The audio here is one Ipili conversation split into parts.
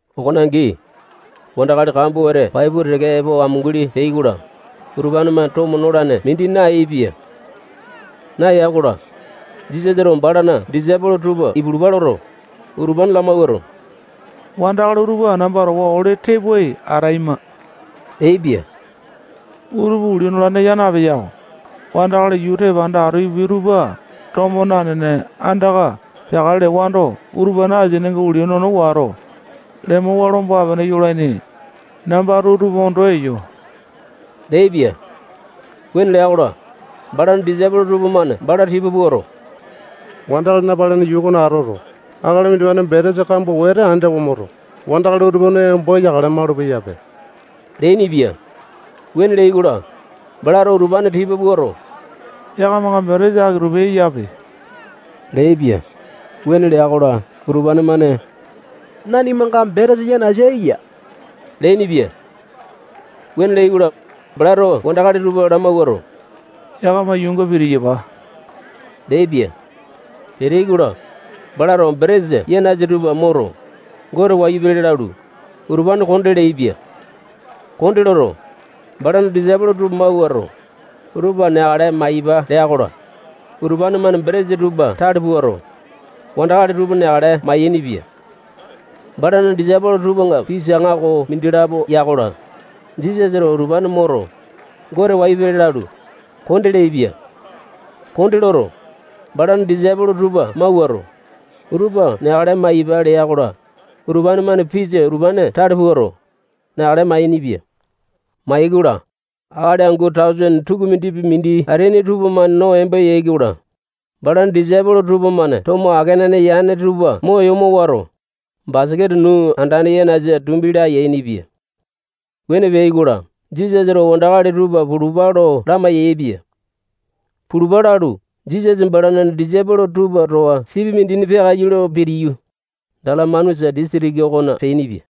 Okone angi, wandakali kambua wete pai pua teke epo amunguli peai-kola, utupane-mane tomo nolane mindi nayaepia. Naya-kola, Jisasato balana disaipolo tupa ipulupa loto, utupane lamawuato, wandakali utupa namba towa ole tepoai ataima leaipia. Utupa ulia nolane yaa napeya-ko. Wandakali yuu tepanda ato ipupiai tupa tomo nanene, andaka peakale lewando, utupane asininga ulia nono wato, lemowa lomba-pene yolaini. Nambato utupa ondo eyo leaipia. Wuane lea-kola, balana disaipolo tupamane bala tipa puato, wandakali napalene yuu okona atoto, akali mindimane betesa kambua wete ani tawe moto, wandakali utupa no embo yakale malupeyape leainipia. Wuane leai-kola, balato utupane tipa puato, yakamanga betesa aki-tupi eyape leaipia. Wuane lea-kola, utupane-mane nanimanga betesa yanasa eya leainipia. Wuane leai-kola, balato wandakali tupa lamawuato, yakama yuunga pitiyapa leaipia. Peteai-kola, balato betesa yanasa tupa moto, Gote wayu pele lalu, utupane konde leaipia. Konde loto, balana disaipolo tupa mawuato, utupa neakale maiyapa lea-kola, utupane-mane betesa tupa tale puato, wandakali tupa neakale mayainipia. Balana disaipolo tupanga pisa aŋako mindilapo ya-kola, Jisasato utupane moto, Gote wayu pele lalu, konde leaipia. Konde loto, balana disaipolo tupa mawuato, utupa neakale maiyapa lea-kola, utupane-mane pisa utupane tale puato, neakale mayainipia. Mayai-kola, akali angu tausene tukumindipi mindi ateaini tupamane no embo yai-kola, balana disaipolo tupamane tomo akenane yane tupa mo yomo wato, basaketa nuu andane yanasa tumbi laya yainipia. Wuane peai-kola, Jisasato wandakali tupa pulupa lo lamai-yaepia. Pulupa lalu, Jisasa balana disaipolo tupa towa sipi mindina peakaiyu lo pitiyu, Dalamanusa disitiki okona peainipia.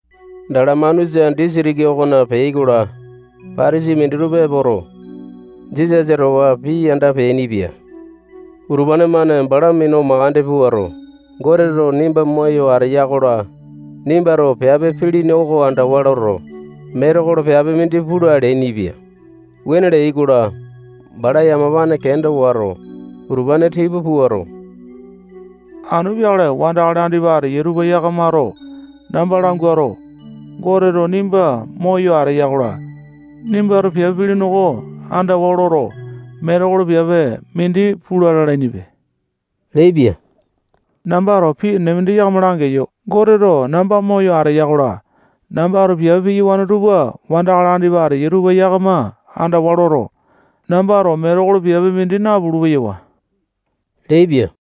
Dalamanusa disitiki okona peai-kola, Patasai minditupa epoto, Jisasa towa pii yanda peainipia. Utupane-mane bala minu mandeke puato, Goteto nimba moyo ateya-kola, nimbato piape pilini oko andawa loto, metekolo piape mindi pula leainipia. Wuane leai-kola, bala yamapane kenda wato, utupane tipa puato, anu peakale wandakali andipa ateyai tupa yakamato namba languato, Goteto nimba moyo ateya-kola, nimbato piape pilini oko andawa loto, metekolo piape mindi pula lalainipe leaipia. Nambato pii enene mindi yakama langeyo. Goteto namba moyo ateya-kola, nambato piape piyawane tupa wandakali andipa ateyai tupa yakama andawa loto, nambato metekolo piape mindi napulu-peyawa leaipia.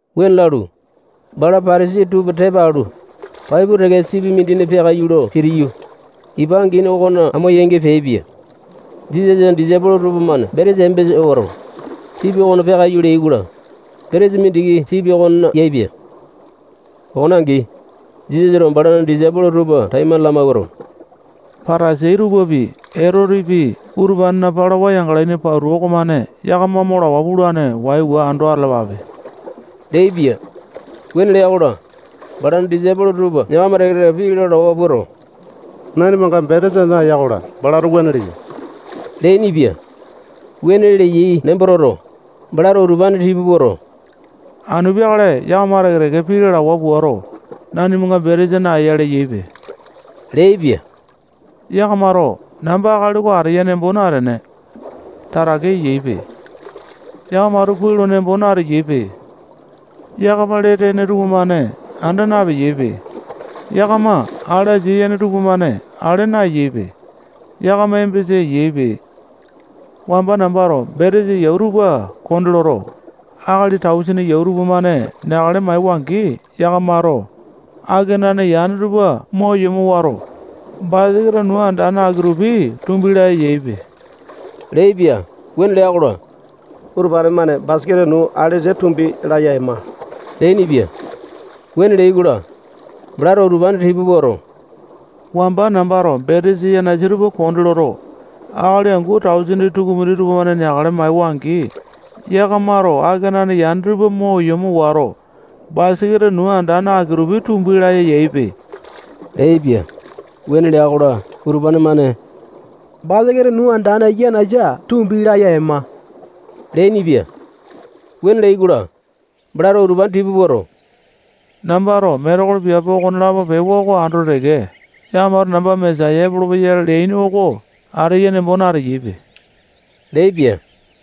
Wuane lalu, bala Patasai tupa tepa alu, pai pua teke sipi mindina peakaiyu lo pitiyu, ipa angini okona amo-yangi peaipia. Jisasana disaipolo tupamane betesa embesa wato, sipi okona peakaiyu leai-kola, betesa mindiki sipi okonena yaepia. Okone angi, Jisasato balana disaipolo tupa taimane lamawuato, Patasai tupapi, Etotepi, utupanena palawa yangalaini pauta okomane yakama mo lawa pulane. Waiwa ando atalapape leaipia. Wuane lea-kola, balana disaipolo tupa yakama teke-teke pii lalawa puato, nanimanga betesa naeya-kola, balato wuane leya leainipia. Wuane leyai nembo toto, balato utupane tipa puato, anu peakale yakama teke-teke pii lalawa puato, nanimanga betesa naeya leyaipe leaipia. Yakamato namba akali oko ateya nembo natene, tatake eyaipe. Yakamato kuai lo nembo nateyaipe. Yakama lee tene tupamane anda napeyaipe. Yakama ale asia yene tupamane ale naeyaipe. Yakama embesa eyaipe. Wamba nambato betesa yau tupa konde loto, akali tausene yau tupamane neakale maewa-angi, yakamato akenane yane tupa mo yomo wato, basaketa nuu andane aki-tupi tumbi laya yaipe leaipia. Wuane lea-kola, utupane-mane basaketa nuu alesa tumbi laya ema leainipia. Wuane leai-kola, balato utupane tipa puato, wamba nambato betesa yanasa tupa konde loto, akali angu tausene tukumindi tupamane neakale maewa-angi, yakamato akenane yane tupa mo yomo wato, basaketa nuu andane aki-tupi tumbi laya yaipe leaipia. Wuane lea-kola, utupane-mane basaketa nuu andane yanasa tumbi laya ema leainipia. Wuane leai-kola, balato utupane tipa puato, nambato metekolo piape okonelapo pewa oko andoto teke, yakamato namba Mesaya epolopeya leaini oko ateya nembo nateyaipe leaipia.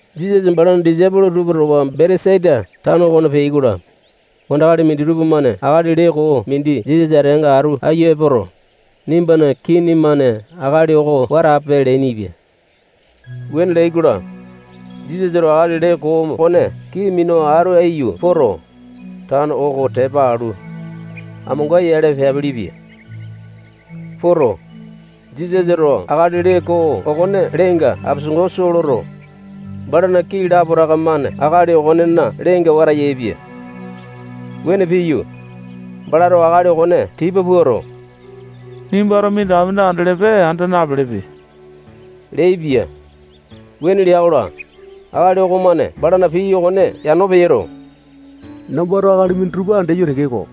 Jisasa balana disaipolo tupa towa Betesaita tano okona peai-kola, wandakali minditupa-mane akali lee koo mindi Jisasa ateanga atu aiyu epoto, nimbana kini-mane akali oko wata ape leainipia. Wuane leai-kola, Jisasato akali lee koo okone kii minu atu aiyu poto, tano oko tepa alu, amonga-yale peapelepia. Poto, Jisasato akali lee koo okona leenga apesango soo loto, balana kii lapotaka-mane akali okonena lenenga wata yaepia. Wuane piyu, balato akali okone tipa puato, nimbato minditaka mindi andelepe, anda napelepe leaipia. Wuane lea-kola, akali okomane balana pii okone yano peyoto, nambato akali minditupa andeyo tekeko,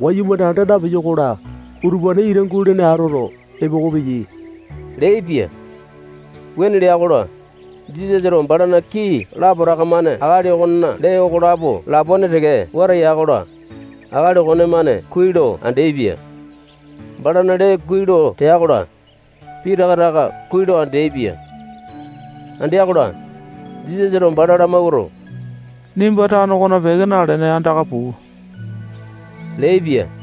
wayumane anda napeyo-kola, utupane ita gulene atoto, epoko peyai leaipia. Wuane lea-kola, Jisasato balana kii lapotaka-mane akali okona lee okolapo lapone teke wata ya-kola, akali okonemane kuai lo andeaipia. Balana lee kuai lo tea-kola, pitaka taka kuai lo andeaipia. Andea-kola, Jisasato bala lamawuato, nimba tano okona peke nalene, andaka puu leaipia.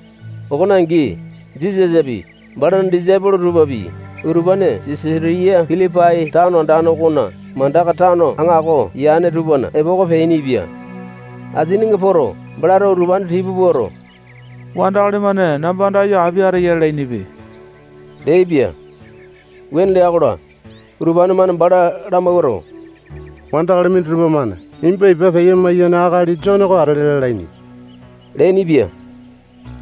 Okone angi, Jisasapi, balana disaipolo tupapi, utupane Sisatiya Pilipai tano andane okona mandaka tano aŋako yane tupana epoko peainipia. Asininga poto, balato utupane tipa puato, wandakali-mane namba andayo api ateya lalainipe leaipia. Wuane lea-kola, utupane-mane bala lamawuato, wandakali minditupa-mane nimba ipa peya-maiyane akali Jone oko atele lalaini leainipia.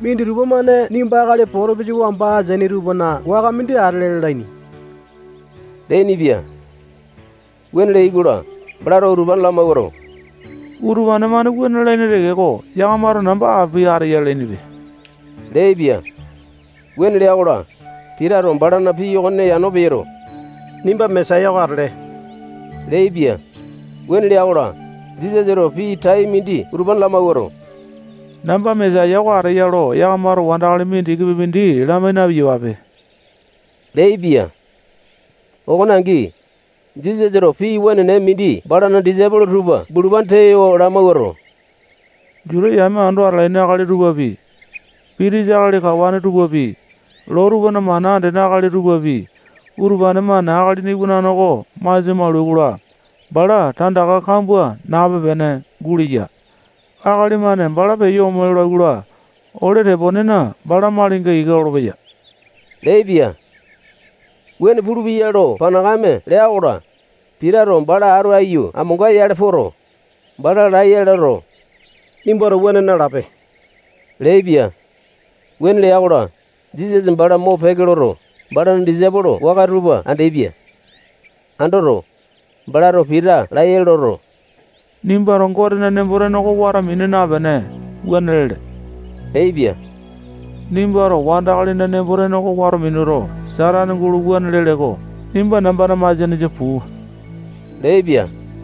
Minditupa-mane nimba Ilainja atele lalaini. Minditupa-mane nimba akali potopisa wamba ateaini tupana waka mindi atele lalaini leainipia. Wuane leai-kola, balato utupane lamawuato, utupane-mane wuane lalaini tekeko, yakamato namba api ateya lalainipe leaipia. Wuane lea-kola, Pitato balana pii okone yano peyoto, nimba Mesaya oko atele leaipia. Wuane lea-kola, Jisasato pii tai mindi utupane lamawuato, namba Mesaya oko ateya lo yakamato wandakali mindikipi mindi lamai na-piyapape leaipia. Okone angi, Jisasato pii wenene mindi balana disaipolo tupa bulupane tewa lamawuato, Juta yame ando atalaini akali tupapi, pitisa akali kawane tupapi, loo tupana mana andene akali tupapi, utupane-mane Akalina Iwanane oko masia maulai-kola, bala tandaka kambua nape-pene guleya. Akali-mane bala peyo ome lolai-kola, ole teponena, bala malinga ika lolopeya leaipia. Wuane pulupeya lo panakame lea-kola, Pitato bala atu aiyu amonga-yale poto, bala laiya loto, nimbato wuane nalape leaipia. Wuane lea-kola, Jisasa bala mopeke loto, balana disaipolo waka tupa andeaipia. Andoto, balato Pita laiya loto, nimbato Gotena nembo-tene oko wato mina napene, wuane lele leaipia. Nimbato wandakalina nembo-tene oko wato minuto, Satane gulo wuane lele-ko. Nimba nambana masianesa puu leaipia.